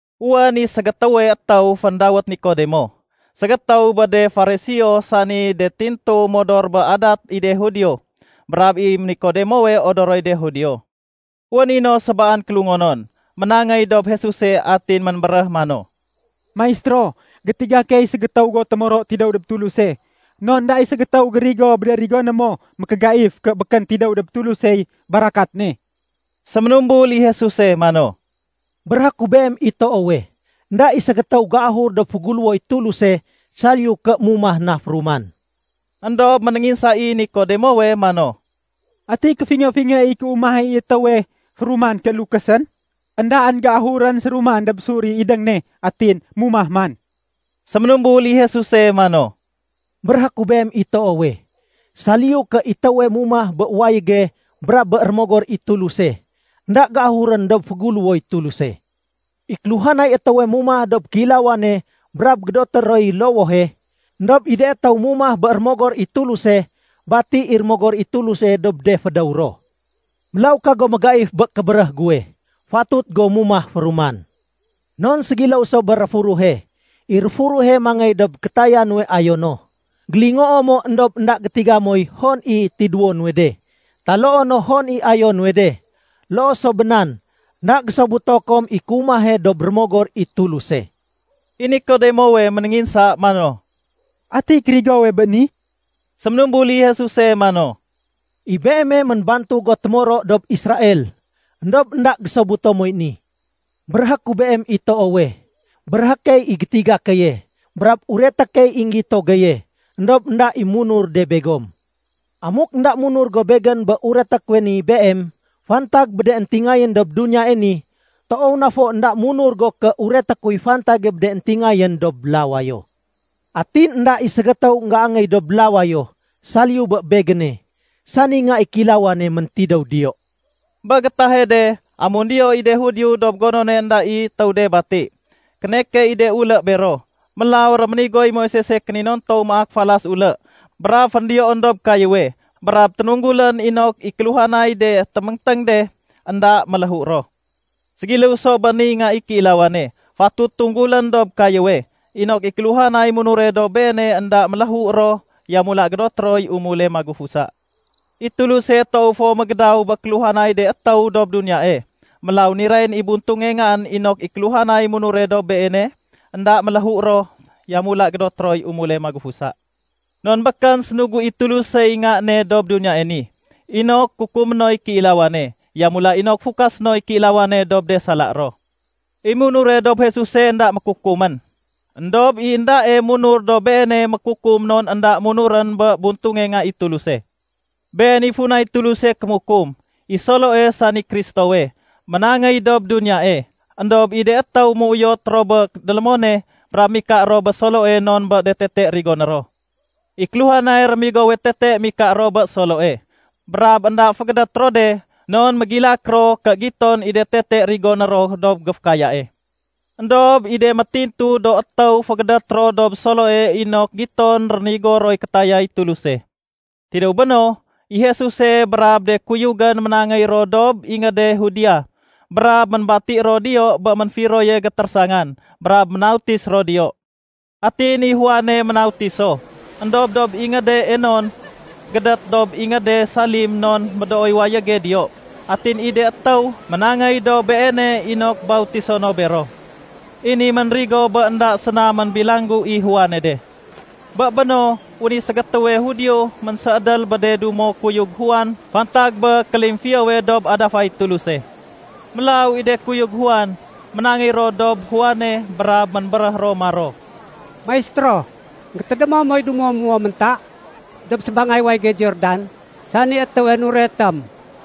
Wén i ségétéwe étéw féndawét Nikodemo, ségétéw bé de Fariseo sani de tintu modor bé adat i de Judio. Brab i Nikodemowe odoroy de Judio. Wén i no sébaan kélungonon, ménangéy dob Jesuse atin ménbéréh mano, “Maistéro, gétiga key ségétéw go témoro tidéw dob Tuluse. Non énda i ségétéw gérigo bé de rigoné mo mékégaif ké békén tidéw dob Tulusey barakat ne.” Séménumbul i Jesuse mano, “Béréhé ku beem i toowe, énda i ségétéw géahur dob féguléwoy Tuluse, saliyu ké mumah na féruman.” Endob ménénginsa i Nikodemowe mano, “Ati kéfingé-fingé i kéumah i étéwe féruman ké lukésén? Endaén géahurén séruman dob sur i idéng ne atin mumah man!” Séménumbul i Jesuse mano, “Béréhé ku beem i toowe, saliyu ké i étéwe mumah bé wayége brab bé Rémogor i Tuluse, énda géahurén dob féguléwoy Tuluse. I kéluhanay étéwe mumah dob kéilawane brab gédoté roy lowohe. Endob i de étéw mumah bé Rémogor i Tuluse, bati i Rémogor i Tuluse dob de fédéw ro. Mélaw kago mégaif bé kébéréh guwe, ‘Fatut go mumah féruman.’ Non ségiléw so bé réfuruhe. I réfuruhe mangéy dob kétaya nuwe ayo no. Gélingoo mo éndob énda gétiga moy hon i tidéwo nuwe de taloo no hon i ayo nuwe de. Loo so bé nan, énda gésobuto kom i kéumahe dob Rémogor i Tuluse.” I Nikodemowe ménénginsa mano, “Ati kérigowe bé ni?” Séménumbul i Jesuse mano, “I beeme ménbantug go témoro dob Israel, éndob énda gésobuto moy ni? Béréhé ku beem i toowe, béréhé key i gétiga keye, brab ureté key i énggito geye, éndob énda i munur de begom. Amuk énda munur go Begén bé ureté kuwe ni beem fantag bé de éntingayén dob duniyae ni, toow na fo énda munur go ké ureté kuy fantage bé de éntingayén dob lawayo. Atin énda i ségétéw énggéangéy dob lawayo, saliyu bé Begéne, sani Nga i Kéilawane méntidéw diyo.” Bé gétahe de, amun diyo i de Judio dob gonone énda i étéw de bati, kéneke i de ulé bero. Mélaw réménigoy Moisese kéninontow maak falas ulé brab féndiyoén dob kayéwe brab ténunggulén inok i kéluhanay de téméngténg de, énda méléhu ro. Ségiléw so bé niy Nga i Kéilawane fatut tunggulén dob kayéwe, inok i kéluhanay munure dob Beene énda méléhu ro, yamula gédoté roy umule magufusa. I Tuluse toow fo mégédaw bé kéluhanay de étéw dob duniyae, mélaw nirayén i buntunge Ngaén inok i kéluhanay munure dob Beene, énda méléhu ro, yamula gédoté roy umule magufusa. Non békén sénugu i Tulusey Nga ne dob duniyae ni inok kukumé noy kéilawane. Yamula inok fukasé noy kéilawane dob de sala ro. I munure dob Jesuse énda mékukumén. Endob i éndae munur dob Beene mékukum non énda munurén bé buntunge Nga i Tuluse. Been i funay Tuluse kémukum: I Soloe, sani Kristowe, ménangéy dob duniyae, éndob i de étéw méuyot ro bé délémone, brab mika ro bé Soloe non bé de tete rigoné ro. I kéluhanay rémigowe tete mika ro bé Soloe brab énda fégédét ro de non mégilak ro ké giton i de tete rigoné ro dob géfékayae. Endob i de métintu do étéw fégédét ro dob Soloe inok giton rénigo roy kétayay Tuluse. Tidéw béno, i Jesuse brab de kuyugén ménangéy ro dob ingéde Judea brab ménbati ro diyo bé ménfiroye gétérésangan, brab ménautis ro diyo. Atin i Juane ménautis so, éndob dob ingéde Enon, gédét dob ingéde Salim non médooy wayége diyo. Atin i de étéw ménangéy dob beene inok bautiso no bero. I ni ménrigo bé énda séna ménbilanggu i Juane de. Bé béno, wén i ségétéwe Judio ménséédél bé de dumo kuyug Juan fantag bé kélimfiyowe dob adafay Tuluse. Mélaw i de kuyug Juan, ménangéy ro dob Juane, brab ménbéréh ro maro, “Maistéro, énggétédémo moy dumo muwo ménta dob sébangay wayége Jordan, sani étéwe nuretém?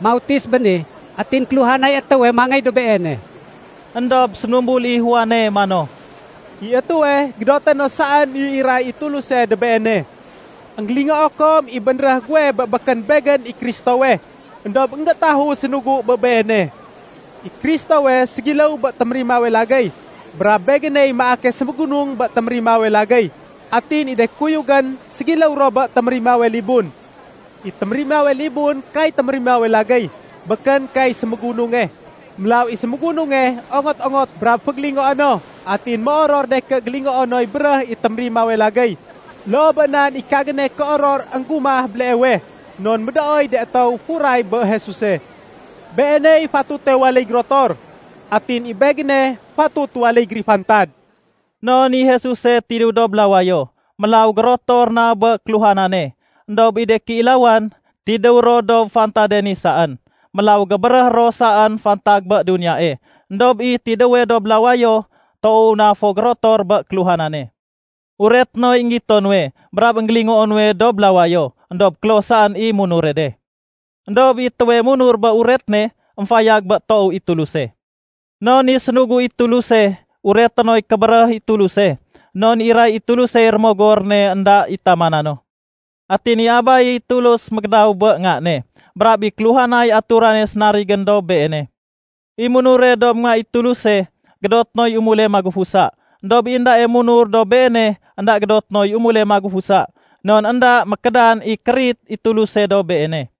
Mautis béni atin kéluhanay étéwe mangéy dob Beene.” Endob séménumbul i Juane mano, “I étéwe gédoté no saén i iray i Tuluse dob beene. Enggélingoo kom i bénréh guwe bé békén begén i Kristowe, éndob énggétahu sénugu bé Beene. I Kristowe ségiléw bé témérimawe lagéy brab begéney maake sémégunung bé témérimawe lagéy. Atin i de kuyugén ségiléw ro bé térimawe libun. I témérimawe libun kay témérimawe lagéy, békén kay sémégununge. Mélaw i sémégununge ongot-ongot brab fégélingoé no atin méoror de ké gélingoo noy béréh i témérimawe lagéy. Loo bé nan i kagéne kéoror énggumah béleewe, non médooy de étéw furay bé Jesuse. Beeney fatute waléy gérotor, atin i begéne fatut waléy gérifantad.” Non i Jesuse tidéw dob lawayo, mélaw gérotor na bé kéluhanane. Endob i de kéilawan, tidéw ro dob fantade ni saén. Mélaw gébéréh ro saén fantag bé duniyae. Endob i tidéwe dob lawayo, toow na fo gérotor bé kéluhanane. Ureté noy énggito nuwe brab énggélingoo nuwe dob lawayo. Endob kloh saén i munure de. Endob i étéwe munur bé uret ne, émfayag bé toow i Tuluse. Non i sénugu i Tuluse, ureté noy kébéréh i Tuluse, non iray i Tulusey Rémogor ne énda i tamana no. Atin i Abaye Tulus mégédaw bé Nga ne brab i kéluhanay ature sénarigén dob Beene. I munure dob Nga i Tuluse, gédoté noy umule magufusa. Endob i éndae munur dob Beene, énda gédoté noy umule magufusa, non énda mékédan i kérit i Tuluse dob beene.